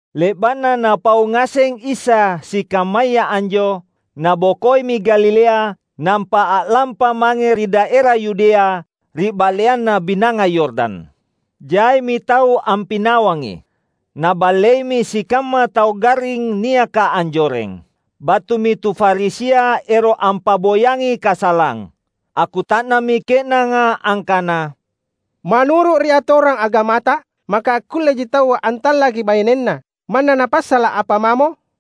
Le’ba’na Napau ngaseng Isa sikammaya anjo, Nabokoimi Galilea, nampa a’lampa mange ri daera Yudea, ri ba’leanna Binanga Yordan. Jaimi tau ampinawangi. Naballeimi sikamma tau garring niaka anjoreng. Battumi tu Farisia ero’ ampa’boyangi kasalang. Akkuta’nammi ke’nanga angkana, "Manuru’ ri atorang agamata, maka akkulleji taua antallaki bainenna manna napassala’ apa mamo?"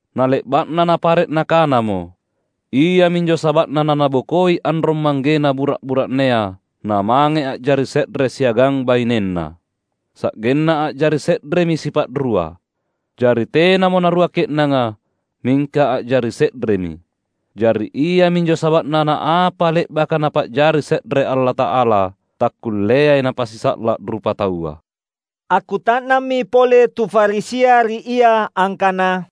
Na le’ba’na Napare’ Nakanamo, ‘Iaminjo saba’na nanabokoi anrong-manggena bura’-bura’nea namange a’jari se’re siagang bainenna, sa’genna a’jari se’remi sipa’rua.’ Jari tenamo narua ke’nanga, mingka a’jari se’remi. Jari iaminjo saba’na naapa le’baka Napa’jari se’re Allata’ala, takkulleai napasisa’la’ rupataua." Akkuta’nammi pole tu Farisia ri Ia angkana,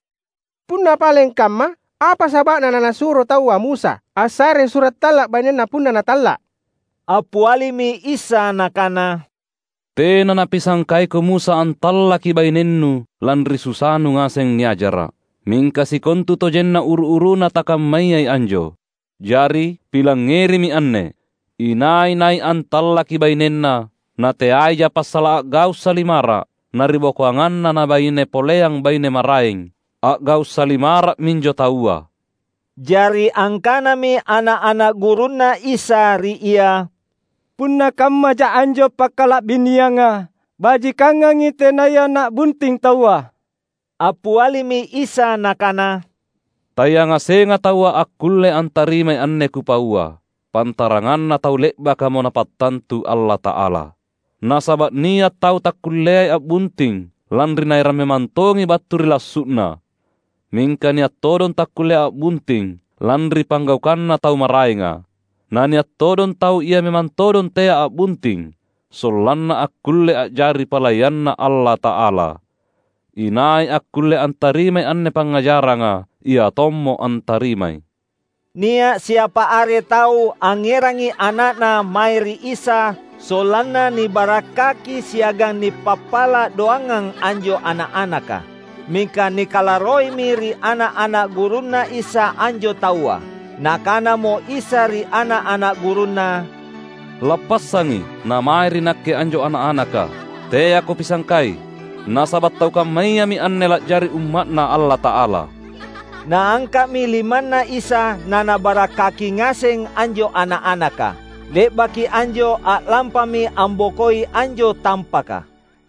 "Punna paleng kamma, apa saba’na nanasuro taua Musa assarei sura’ talla’ bainenna punna natalla’?" Appialimi Isa Nakana, "Tena napisangkaiko Musa antallaki bainennu lanri susanu ngaseng niajara’. Mingka sikontutojenna uru-uruna takammayai anjo. Jari, pilangngerimi anne: Inai-nai antallaki bainenna — nateaija passala’ a’gau’ salimara’ — na ribokoanganna na’baine poleang baine maraeng, a’gau’ salimara’ minjo taua." Jari angkanami ana’-ana’ gurunNa Isa ri Ia, "Punna kammaja anjo pakkalabinianga, bajikangangi tenaya na’bunting taua." Appialimi Isa Nakana, "Tayangasenga taua akkulle antarimai anne Kupaua, pantaranganna tau le’bakamo Napattantu Allata’ala. Nasaba’ nia’ tau takkulleai a’bunting lanri naerang memang tongi battu ri lassu’na. Mingka nia’ todong takkullea a’bunting lanri panggaukanna tau maraenga. Nania’ todong tau ia memang todong tea a’bunting sollanna akkulle a’jari palayanNa Allata’ala. Inai akkulle antarimai anne pangngajaranga, ia tommo antarimai." Nia’ siapa are tau angngerangi ana’na mae ri Isa sollanna nibarakkaki siagang nipappala’ doangang anjo ana’-anaka. Mingka nikalarroimi ri ana’-ana’ gurunNa Isa anjo taua. Nakanamo Isa ri ana’-ana’ gurunNa, "Lappassangi namae ri Nakke anjo ana’-anaka, teako pisangkai. Nasaba’ tau kammayami anne la’jari umma’Na Allata’ala." Naangka’mi limanNa Isa naNabarakkaki ngaseng anjo ana’-anaka. Le’baki anjo a’lampami ambokoi anjo tampaka.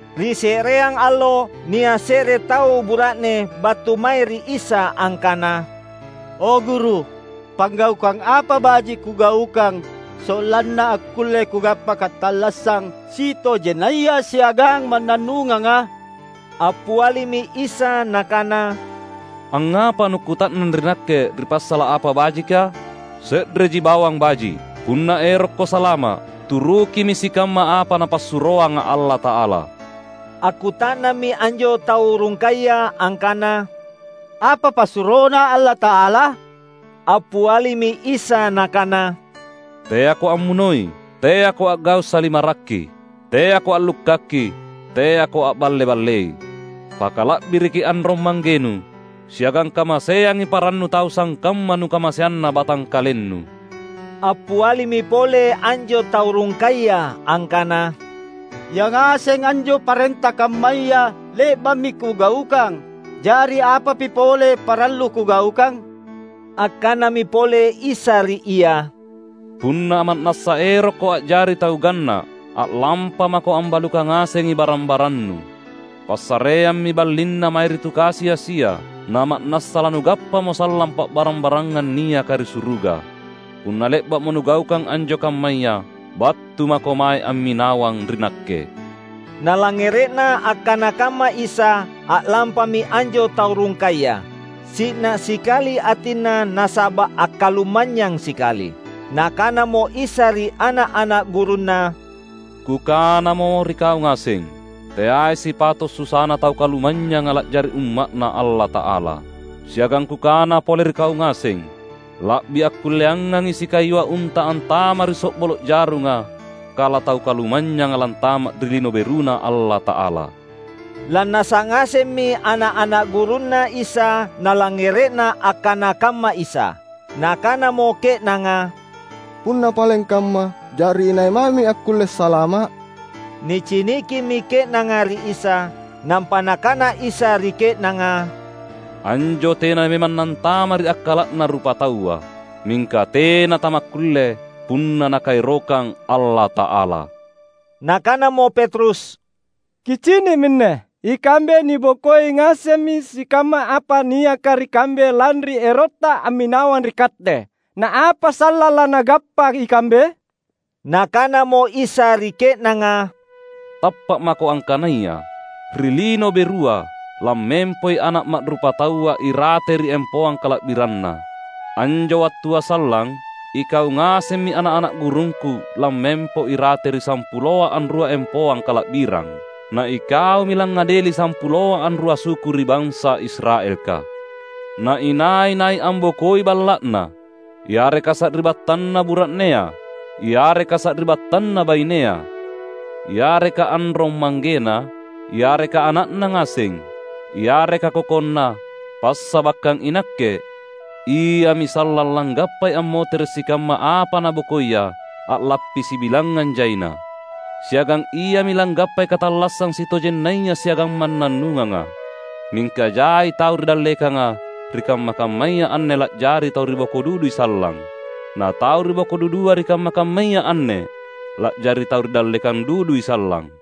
Ri se’reang allo, nia’ se’re tau bura’ne battu mae ri Isa angkana, "O Guru, panggaukang apa baji’ kugaukang sollanna akkulle kugappa katallassang sitojennaya siagang mannannunganga?" Appialimi Isa Nakana, "Angngapa nukkuta’nang ri Nakke ri passala’ apa bajika? Se’reji bawang baji’. Punna erokko salama’, turukimi sikamma apa Napassuroanga Allata’ala." Akkuta’nammi anjo tau rungkaya angkana, "Apa passuroNa Allata’ala?" Appialimi Isa Nakana, "Teako ammunoi; teako a’gau’ salimararri; teako a’lukkaki; teako a’balle-ballei; pakala’biriki anrong-manggenu; siagang kamaseangi parannu tau sangkamma nukamaseanna batangkalennu." Appialimi pole anjo tau rungkaya angkana, "Yangaseng anjo parenta kammaya le’ba’mi kugaukang. Jari apapi pole parallu kugaukang?" Akkanami pole Isa ri ia, "Punna ma’nassa erokko a’jari tau ganna’, a’lampamako ambalukang ngasengi barang-barannu. Passareammi ballinna mae ri tu kasi-asia, nama’nassa lanugappamo sallang pa’barang-barangang niaka ri suruga. Punna le’ba’mo nugaukang anjo kammaya, battu mako mae amminawang ri Nakke!" Nalangngere’na akkana kamma Isa, a’lampami anjo tau rungkaya; si’na sikali atinna nasaba’ akkalumanynyang sikali. Nakanamo Isa ri ana’-ana’ gurunNa, "Kukanamo ri kau ngaseng, teai sipato’ susana tau kalumanynyanga la’jari umma’Na Allata’ala. Siagang Kukana pole ri kau ngaseng; la’bi akkulleangangi sikayua unta antama’ ri so’bolo’ jarunga kala tau kalumanynyanga lantama’ ri Lino BeruNa Allata’ala." Lannasa’ ngasemmi ana’-ana’ gurunNa Isa nalangngere’na akkana kamma Isa. Nakanamo ke’nanga, "Punna paleng kamma, jari inai mami akkulle salama’?" Nicinikimi ke’nanga ri Isa; nampa Nakana Isa ri ke’nanga, "Anjo tena memang nantama’ ri akkala’na rupataua. Mingka tena tamakkulle punna Nakaerokang Allata’ala." Nakanamo Petrus, "Kicini’ minne, ikambe nibokoi ngasemmi sikamma apa niaka ri kambe lanri erotta amminawang ri Katte. Na apa sallang lanagappa ikambe?" Nakanamo Isa ri ke’nanga, "Tappa’ mako angkanaya: Ri Lino Berua, lammempoi Ana’ Ma’rupataua irate ri empoang kala’biranNa. Anjo wattua sallang, ikau ngasemmi ana’-ana’ gurungKu lammempo irate ri sampuloa anrua empoang kala’birang. Na ikaumi langngadeli sampuloa anrua suku ri bansa Israelka! Na inai-nai ambokoi balla’na, yareka sari’battanna bura’nea, yareka sari’battanna bainea, yareka anrong-manggena, yareka ana’na ngaseng, yareka kokonna, passabakkang iNakke, iami sallang langgappai ammotere’ sikamma apa nabokoia a’lappi sibilangngang jaina. Siagang iami langgappai katallassang sitojennaya siagang mannannunganga. Mingka jai tau ri dallekanga ri kamma-kammaya anne la’jari tau ri boko dudui sallang. Na tau ri boko dudua ri kamma-kammaya anne la’jari tau ri dallekang dudui sallang."